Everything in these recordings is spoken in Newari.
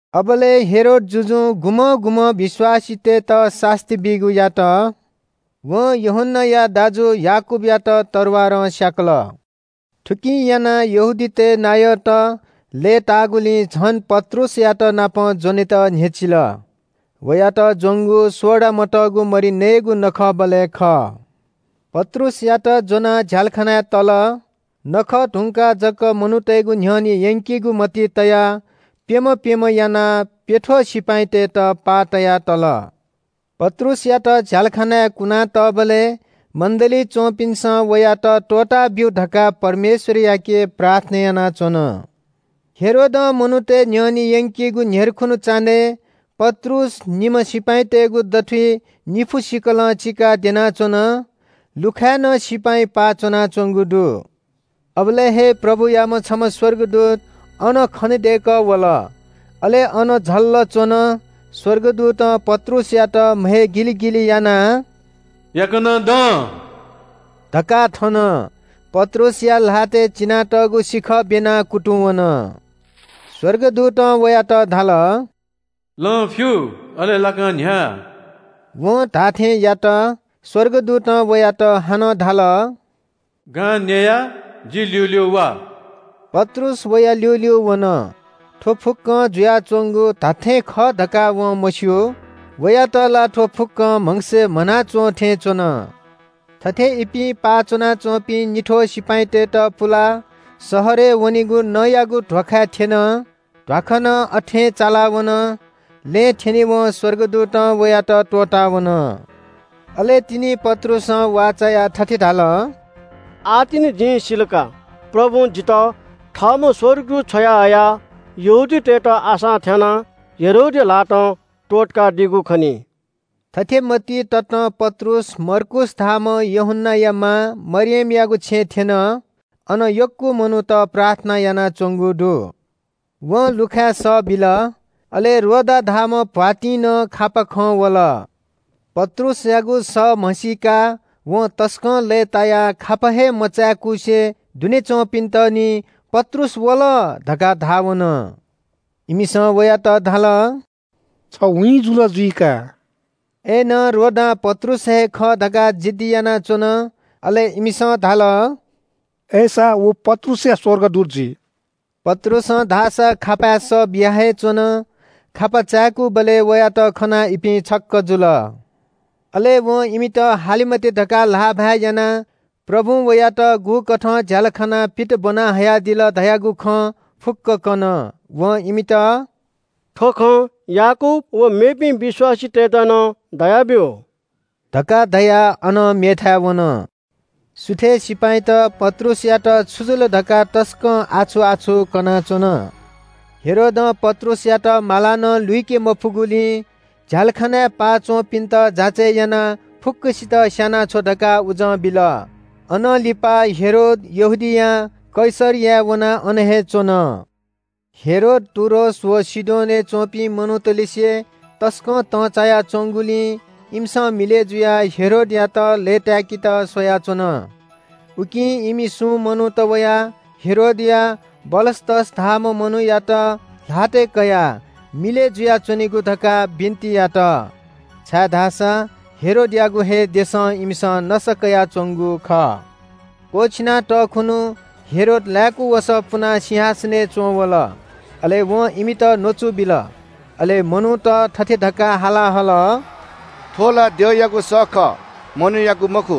अबलय् हेरोद जुजुं गुम्‍हं गुम्‍हं विश्‍वासीतय्‌त सास्‍ती बीगु यात। वं यूहन्‍नाया दाजु याकूबयात तरवारं स्‍याकल। थुकिं यानाः यहूदीतय् नायःत लय्‌ताःगुलिं झन पत्रुसयातनापं ज्‍वनेत न्‍ह्यचिल। वयात ज्‍वंगु सोडा मतःगु मरि नयेगु नखःबलय् खः। पत्रुसयात ज्‍वनाः झ्‍यालखानाय् तल। छुत्‍काराया नखः धुंकाः जक मनूतय्‌गु न्‍ह्यःने यंकेगु मतिइ तयाः प्‍यम्‍ह प्‍यम्‍ह यानाः प्‍यथ्‍वः सिपाइँतय्‌त पाः तया तल। पत्रुसयात झ्‍यालखानाय् कुनातःबलय् मण्‍डलीइ च्‍वंपिन्‍सं वयात त्‍वःताब्‍यु धकाः परमेश्‍वरयाके प्रार्थना यानाच्‍वन। हेरोदं मनूतय् न्‍ह्यःने यंकेगु न्‍ह्यर्खुन्‍हु चान्‍हय् पत्रुस निम्‍ह सिपाइँतय्‌गु दथुइ निपु सिखलं चिकाः द्यनाच्‍वन। लुखाय् नं सिपाइँ पाः च्‍वनाच्‍वंगु दु। अबलय् हे प्रभुयाम्‍ह छम्‍ह स्‍वर्गदूत अन खनेदय्‌कः वल। अले अन झल्‍ल च्‍वन। स्‍वर्गदूतं पत्रुसयात म्‍हय् गिलिगिलि यानाः “याकनं दँ” धकाः थन। पत्रुसया ल्‍हातय् चिनातःगु सिखः ब्‍यनाः कुतुंवन। स्‍वर्गदूतं वयात धाल – “लं फ्‍यु अले लाकां न्‍ह्या।” वं धाःथें यात। स्‍वर्गदूतं वयात हानं धाल – “गां न्‍ययाः जि ल्‍यूल्‍यू वा।” पत्रुस वया ल्‍यूल्‍यू वन। थ्‍व फुक्‍कं जुयाच्‍वंगु धात्‍थें खः धकाः वं मस्‍यू। वयात ला थ्‍व फुक्‍कं म्‍हगसय् म्‍हना च्‍वंथें च्‍वन। थथे इपिं पाः च्‍वनाच्‍वंपिं निथ्‍वः सिपाइँतय्‌त पुलाः शहरय् वनेगु नँयागु ध्‍वाखाय् थ्‍यन। ध्‍वाखा नं अथें चालावन, लँय् थ्‍यनेवं स्‍वर्गदूतं वयात त्‍वःतावन। अले तिनि पत्रुसं वाः चायाः थथे धाल – “आः तिनि जिं सिल का, प्रभुं जितः थःम्‍ह स्‍वर्गदूत छ्वयाहयाः यहूदीतय्‌त आशां थ्‍यानाः हेरोदया ल्‍हातं त्‍वःतकादीगु खनी।” थथे मतिइ ततं पत्रुस मर्कूस धाःम्‍ह यूहन्‍नाया मां मरियमयागु छेँय् थ्‍यन। अन यक्‍व मनूत प्रार्थना यानाच्‍वंगु दु। वं लुखाय् सः बिल। अले रोदा धाःम्‍ह भ्‍वातिंनं खापा खं वल। पत्रुसयागु सः म्‍हसीकाः वं तसकं लय्‌तायाः खापा हे मचाय्‌कुसे दुने च्‍वंपिन्‍त निं “पत्रुस वल” धकाः धाः वन। इमिसं वयात धाल – “छ वीँ जुल जुइ का।” अय्‌नं रोदां पत्रुस हे खः धकाः जिद्दी यानाच्‍वन। अले इमिसं धाल – “अय्‌सा व पत्रुसया स्‍वर्गदूत जुइ।” पत्रुसं धाःसा खापाय् सः बिया हे च्‍वन। खापा चाय्‌कूबलय् वयात खनाः इपिं छक्‍क जुल। अले वं इमित हाले मते धकाः ल्‍हाःभाय् यानाः प्रभुं वयात गुकथं झ्‍यालखानां पित ब्‍वना हयादिल धयागु खँ फुक्‍क कन। वं इमित – “थ्‍व खँ याकूब व मेपिं विश्‍वासीतय्‌त नं धयाब्‍यु” धकाः धयाः अनं मेथाय् वन। सुथय् सिपाइँत “पत्रुसयात छु जुल” धकाः तसकं आछु-आछु कनाच्‍वन। हेरोदं पत्रुसयात मालां नं लुइके मफुगुलिं झ्‍यालखानाय् पाः च्‍वंपिन्‍त जाँचय् यानाः फुक्‍कसित स्‍यानाछ्व धकाः उजं बिल। अनं लिपा हेरोद यहूदियां कैसरियाय् वनाः अन हे च्‍वन। हेरोद टुरोस व सिडोनय् च्‍वंपिं मनूतलिसे तसकं तंचाया च्‍वंगुलिं इमिसं मिलय् जुयाः हेरोदयात लय्‌ताय्‌केत स्‍वयाच्‍वन। उकिं इमि सुं मनूत वयाः हेरोदया बलस्‍तस धाःम्‍ह मनूयात ल्‍हातय् कयाः मिलय् जुयाच्‍वनेगु धकाः बिन्‍ति यात, छाय्‌धाःसा हेरोदयागु हे देशं इमिसं नसा कयाच्‍वंगु खः। क्‍वःछिना तःखुन्‍हु हेरोद लाय्‌कू वसः पुनाः सिंहासनय् च्‍वंवल। अले वं इमित न्‍वचु बिल। अले मनूत थथे धकाः हाला हल – “थ्‍व ला द्यःयागु सः खः, मनूयागु मखु।”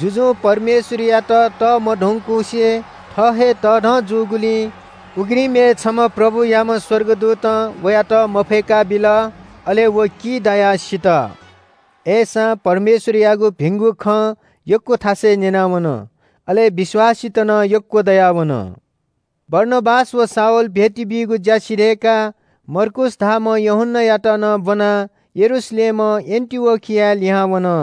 जुजुं परमेश्‍वरयात तःमधंकुसे थः हे तःधं जूगुलिं उघ्रिमय् छम्‍ह प्रभुयाम्‍ह स्‍वर्गदूतं वयात मफय्‌काबिल। अले व की दायाः सित। अय्‌सां परमेश्‍वरयागु भिंगु खँ यक्‍व थासय् न्‍यनावन, अले विश्‍वासीत नं यक्‍व दयावन। बारनाबास व शाऊल भेटी बीगु ज्‍या सिधय्‌काः मर्कूस धाःम्‍ह यूहन्‍नायात नं ब्‍वनाः यरूशलेमं एन्‍टिओखियाय् लिहां वन।